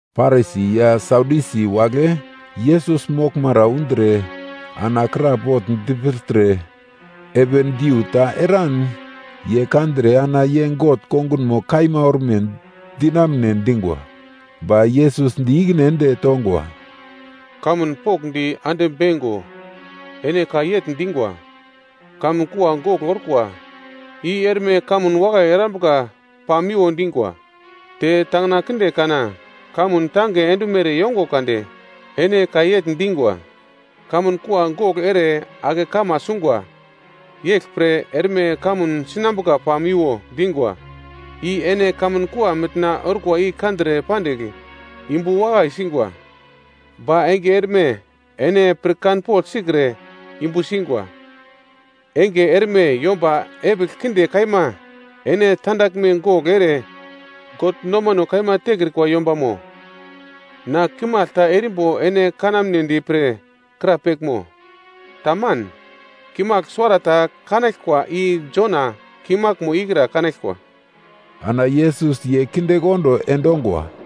Parisi ya Sadyusi wagle Yesus moglmara undre ana krapogl dipirtre, heven diu ta eran ye kandre ana ye God kongunmo kaima orme dinamune dingwa. Ba Yesus di ikine ende tongwa, “Kamun pokndi ande beingo ene ka yegl dingwa, ‘Kamun kua gogl orkwa, i erme kamun wakai erambuka pamiwo dingwa.’ Te tangina kinde kana kamun tange endumere yongo kade, ene ka yegl dingwa, ‘Kamun kua gogl ere ake kama sungwa. Yeglpre erme kamun sinambuka pamiwo’ dingwa, i ene kamun kua mitna orkwa i kandre pandigl yumbu wakai singwa. Ba enge erme ene pirkanpogl sikre yumbu singwa. Enge erme yomba epigl kinde kaima, ene tandaglme gogl ere God nomano kaima tekrikwa yombamo. Na kimagl ta erimbo ene kanamnedi pre krapeglmo? Taman! Kimagl suwarata kanaglkwa i Jona kimaglmo ikra kanaglkwa.” Ana Yesus ye kindekondo endongwa.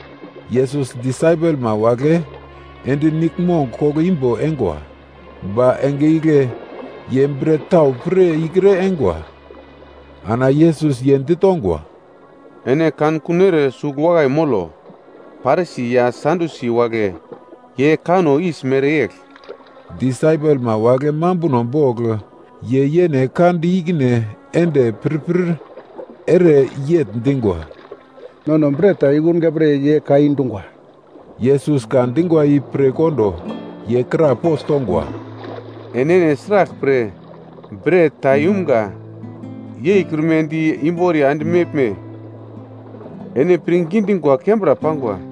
Yesus disaipelma wagle ende niglmong koglo imbo eingwa, ba enge igle ye bret tau pir ikre eingwa. Ana Yesus ye ditongwa, “Ene kankun ere sugl wakai molo. Parisi ya Sadyusi wagle ye kanno yis mereyegl.” Disaipelma wagle mambuno bogl ye yene ka di ikine ende pirpir ere yegl dingwa, “Nono bret ta yukunga pre ye ka i dungwa.” Yesus ka dingwa i pir kondo ye krapogl tongwa, “Enene sraglpre bret ta yumga yeikrumedi di imboriya ende meglme? Ene pirngi dingwa kembra pangwa.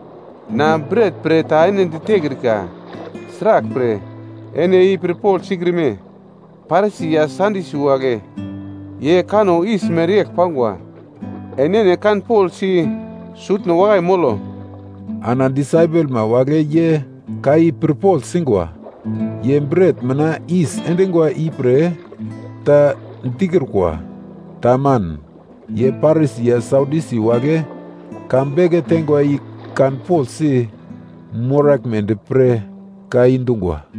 Na bret pre ta ene ditekrikra, sraglpre ene i pirpogl sikrime? Parisi ya Sadyusi wagle ye kanno yis mereyegl pangwa, enene kanpoglsi sutno wakai molo.” Ana disaipelma wagle ye ka i pirpogl singwa, ye bret mina yis endingwa ipre ta dikrukwa. Taman. Ye Parisi ya Sadyusi wagle ka beke teingwa i kanpoglsi moraglmedi pre ka i dungwa.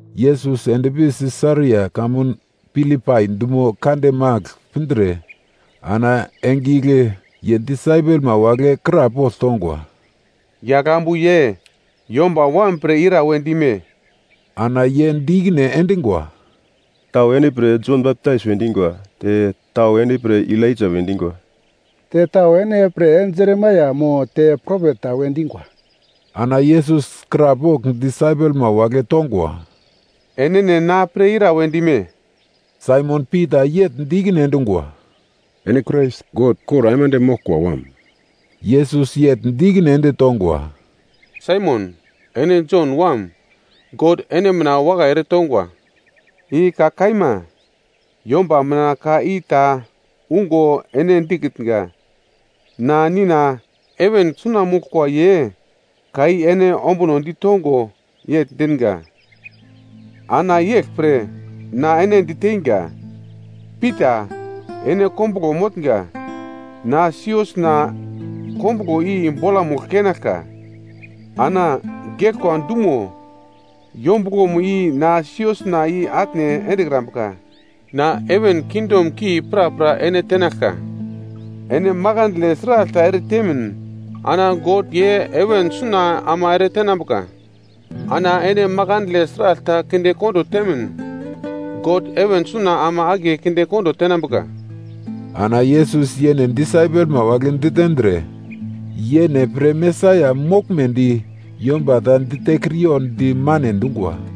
Yesus endpi Sisaria kamun Filipai dumo kande magl pindre, ana enge igle ye disaipelma wagle krapogl tongwa, “Yagl ambu ye Yomba Wam pre ira we dime?” Ana ye di ikine endingwa, “Tau ene pre Jon Baptais we dingwa. Te tau ene pre Elaija we dingwa. Te tau ene pre Jeremaia mo, te propet ta we dingwa.” Ana Yesus krapogl disaipelma wagle tongwa, “Enene na pre ira we dime?” Saimon Pita yegl di ikine endungwa, “Ene Krais, God kor aimande moglkwa Wam.” Yesus yegl di ikine ende tongwa, “Saimon ene Jon wam, God ene mina wakai eretongwa. I ka kaima, yomba mina ka i ta ungo ene dikitnga; na Nina heven suna moglkwa ye ka i ene ombuno ditongo yegl dinga. Ana yeglpre na ene diteinga, Pita, ene kombuglo motnga, na siosna kombuglo i bolamugl keinaglka. Ana geglkwa dumo yombuglomo i na siosna i-atne endekrambuka. Na heven kingdom ki prapra ene tenaglka, ene makandle sragl ta eretemin, ana God ye heven suna ama eretenambuka. Ana ene makandle sragl ta kindekondo temin, God heven suna ama akiye kinde kondo tenambuka.” Ana Yesus yene disaipelma wagle ditendre yene pre Mesaia moglmedi, yomba ta ditekriyo di mane dungwa.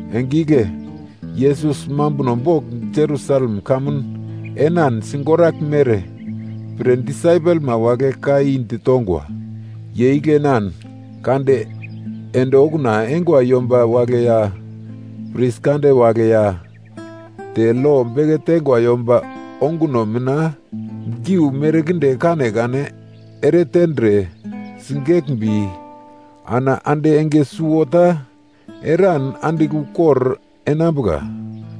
Enge igle Yesus mambuno bogl Jerusalem kamun enan sigoraglmere pre disaipelma wagle ka i ditongwa. Ye igle enan kade ende okuna eingwa yomba wagle ya pris kande wagle, ya te lo beke teingwa yomba onguno mina geu merkinde kanekane eretendre, sigeglmbi ana ande enge suwota eran andigl ukor enambuka.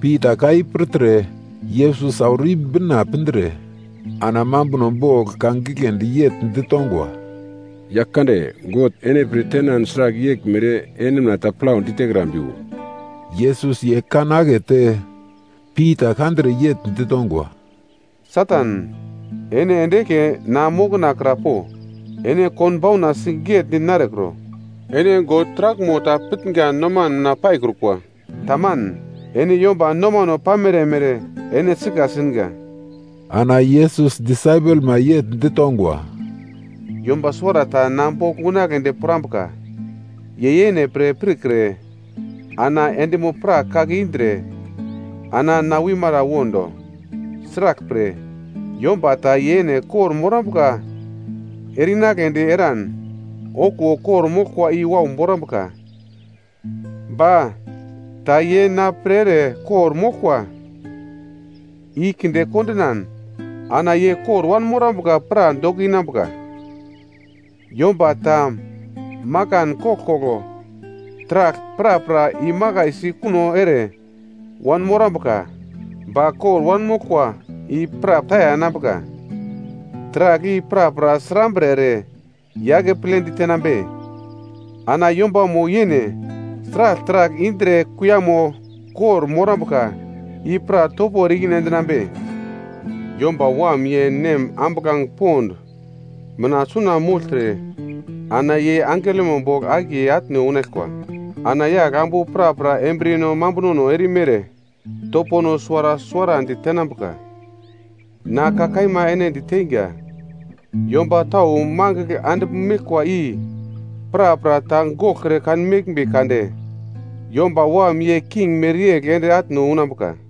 Pita ka i pirtre Yesus auro i-bina pindre ana mambuno bogl ka giglendi yegl ditongwa, “Yaglkande, God ene pir tenan sragl yeglmere ene mina ta plaudi tekrambiwo!” Yesus ye kan akete Pita kandre yegl ditongwa, “Satan, ene ende eglke na mokona kra po! Ene konbauna sigetdi narekro. Ene God taraglmo ta pitnga noman mina paikrukwa. Taman. Ene yomba nomano pamere mere ene sika singa.” Ana Yesus disaipelma yegl ditongwa, “Yomba suwarata na bogl unagledi pirambuka, ye yene pre pirkre ana endimo-prak kake indre, ana na wimara wondo. Sraglpre, yomba ta yene kor-morambuka ere-inagledi eran, okuwo kor-moglkwa i wau borambuka. Ba, ta ye na pre ere kor-moglkwa i kinde kondinan, ana ye kor wanmorambuka pra doko inambuka. Yomba ta makan koglkoglo taragl prapra imakaisi kuno ere wanmorambuka, ba kor wanmoglkwa i pra taya enambuka. Taragl i prapra srambre ere ye akeple ditenambe? Ana yombamo yene sragl taragl indre kuiyamo kor-morambuka i pra topo ere i-ikine endinambe? Yomba Wam ye Nem ambuglange pond mina suna mogltre ana ye angelomo bogl akiye atne unaglkwa. Ana yagl ambu prapra embriyeno mambunono erimere topono suwara suwarandi tenambuka. Na ka kaima ene diteinga, yomba tau magl andigl meglkwa i prapra ta goglkre kanmeglmbi kade, Yomba Wam ye king mereyegl ende atne unambuka.”